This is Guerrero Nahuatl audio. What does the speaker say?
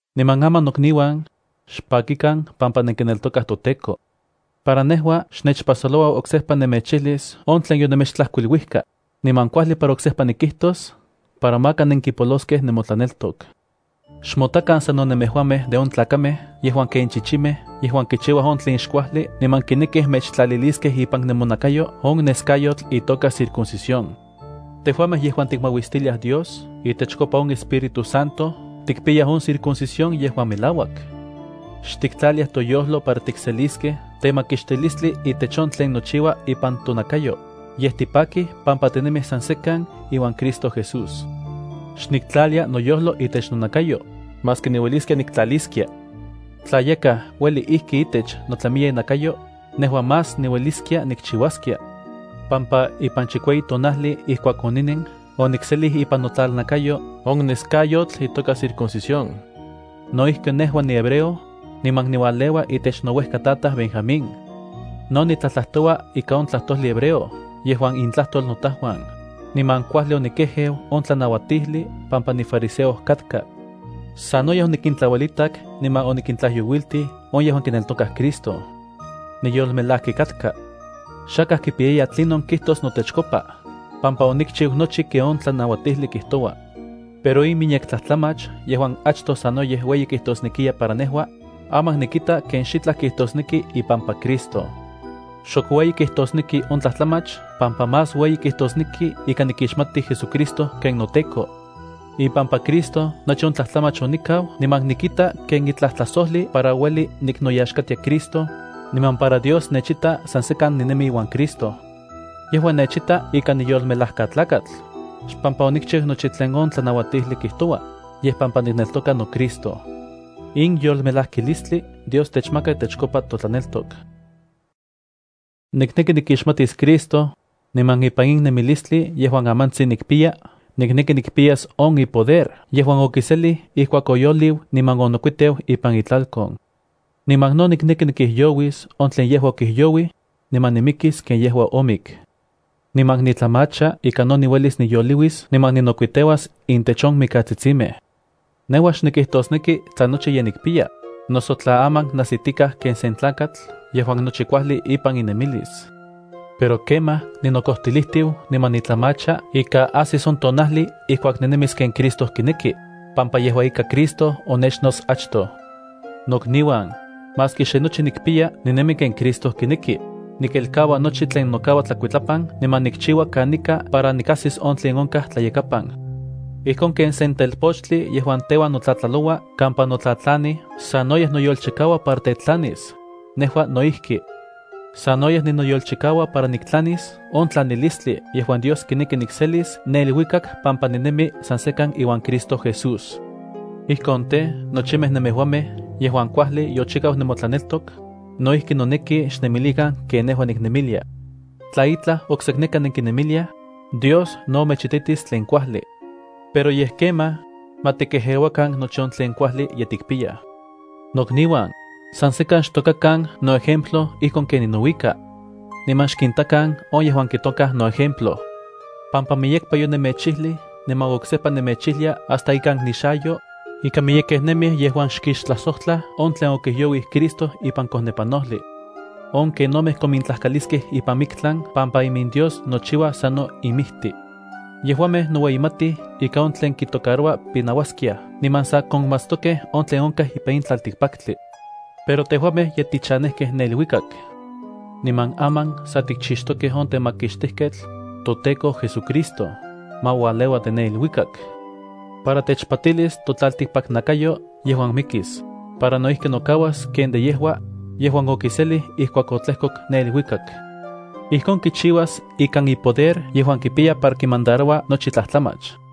Niman aman nokniuan, xpakikan pampa nenkineltokaj toTEKO. Para nejua xnechpajsoloua oksejpa nemechijlis on tlen yonemechtlajkuiluijka, niman kuajli para oksejpa nikijtos para maka nenkipoloskej nemotlaneltok. Xmotakan sano nemejuamej de on tlakamej yejuan ken chichimej yejuan kichiuaj on tlen xkuajli niman kinekij mechtlaliliskej ipan nemonakayo on neskayotl itoka circuncisión. Tejuamej yejuan tikmauistiliaj Dios itechkopa on Espíritu Santo tikipiyaj on circuncisión yejuan melauak. Xtiktlaliaj toyojlo para tikseliskej temakixtilistli itech on tlen nochiua ipan tonakayo, yej tipakij pampa tinemij san sekan iuan Cristo Jesús. Xniktlalia noyojlo itech nonakayo, maski niueliskia niktlaliskia. Tla yakaj ueli ijki itech notlamiya inakayo, nejua más niueliskia nikchiuaskia, pampa ipan chikueyi tonajli ijkuak oninen onikselij ipan notlalnakayo on neskayotl itoka circuncisión. No ijki nejua nihebreo, niman niualeua itech nouejkatataj Benjamín. No nitlajtlajtoua ika on tlajtojli hebreo yejuan intlajtol notajuan, niman kuajli onikejeu on tlanauatijli pampa nifariseo katka. Sanoyej onikintlauelitak niman onikintlajyouiltij on yejuan kineltokaj Cristo. Niyolmelaki katkaj. Xakaj kipiyaya tlinon kijtos notechkopa, pampa onikchiu nochi ken on tlanauatijli kijtoua. Pero in miyek tlajtlamach yejuan achtoj sanoyej ueyi kijtosnekiya para nejua, aman nikita ken xitlaj kijtosneki ipampa Cristo. Xok ueyi kijtosneki on tlajtlamach pampa más ueyi kijtosneki ika nikixmati JesuCristo ken noTEKO. Ipampa Cristo nochi on tlajtlamach onikau niman nikita ken itlaj tlajsojli para ueli niknoyaxkatia Cristo, niman para Dios nechita san sekan ninemi iuan Cristo. Yejua nechita ika niyolmelajkatlakatl, xpampa onikchiu nochi tlen on tlanauatijli kijtoua, yej pampa nikneltoka noCristo. In yolmelajkilistli Dios techmaka itechkopa totlaneltok. Nikneki nikixmatis Cristo, niman ipan in nemilistli yejuan amantsin nikpiya nikneki nikpiyas on ipoder yejuan okiselij ijkuak oyoliu niman onokuiteu ipan itlalkon. Niman no nikneki nikijyouis on tlen yejua okijyouij, niman nimikis ken yejua omik. Niman nitlamacha ika no niuelis niyoliuis niman ninokuiteuas intech on mikatsitsimej. Nejua xnikijtosneki tla nochi ye nikpiya, noso tla aman najsitikaj ken sen tlakatl yejuan nochi kuajli ipan inemilis. Pero kemaj ninokojtilijtiu niman nitlamacha ika ajsis on tonajli ijkuak ninemis ken Cristo kineki, pampa yejua ika Cristo onechnots achtoj. Nokniuan, maski xe ninemi ken Christo kineki, nikelkaua nochi tlen nokaua tlakuitlapan niman nikchiua kanika para nikajsis on tlen onkaj tlayakapan. Ijkon ken sen telpochtli yejuan teuan notlatlaloua kampa notlatlanij sanoyej noyolchikaua para tetlanis, nejua no ijki. Sanoyej ninoyolchikaua para niktlanis on tlanilistli yejuan Dios kineki nikselis ne iluikak pampa ninemi san sekan iuan Cristo Jesús. Ijkon tej, nochimej nemejuamej yejuan kuajli yochikau nemotlaneltok, no ijki noneki xnemilikan ken nejua niknemilia. Tla itlaj oksekneka nenkinemiliaj, Dios no mechititis tlen kuajli. Pero yej kemaj, ma tikejeuakan nochi on tlen kuajli ye tikpiyaj. Nokniuan, san sekan xtokakan noejemplo ijkon ken ninouika. Niman xkintakan on yejuan kitokaj noejemplo, pampa miyekpa yonemechijlij niman oksejpa nemechijlia hasta ikan nixayo, ika miyekej nemij yejuan xkixtlajsojtlaj on tlen okijyouij Cristo ipan kojnepanojli. On kenomej komintlajkaliskej ipan miktlan pampa imindios nochiuaj sano inmijtij. Yejuamej noueyimatij ika on tlen kitocaroua pinauaskiaj niman san konmatstokej on tlen onkaj ipan in tlaltikpaktli. Pero tejuamej ye tichanejkej ne iluikak. Niman aman sa tikchixtokej on Temakixtijketl, toTEKO JesuCristo, ma ualeua de ne iluikak, para techpatilis totlaltikpaknakayo yejuan mikis, para no ijki nokauas ken de yejua, yejuan okiselij ijkuak otlejkok ne iluikak. Ijkon kichiuas ikan ipoder yejuan kipiya para kimandaroua nochi tlajtlamach.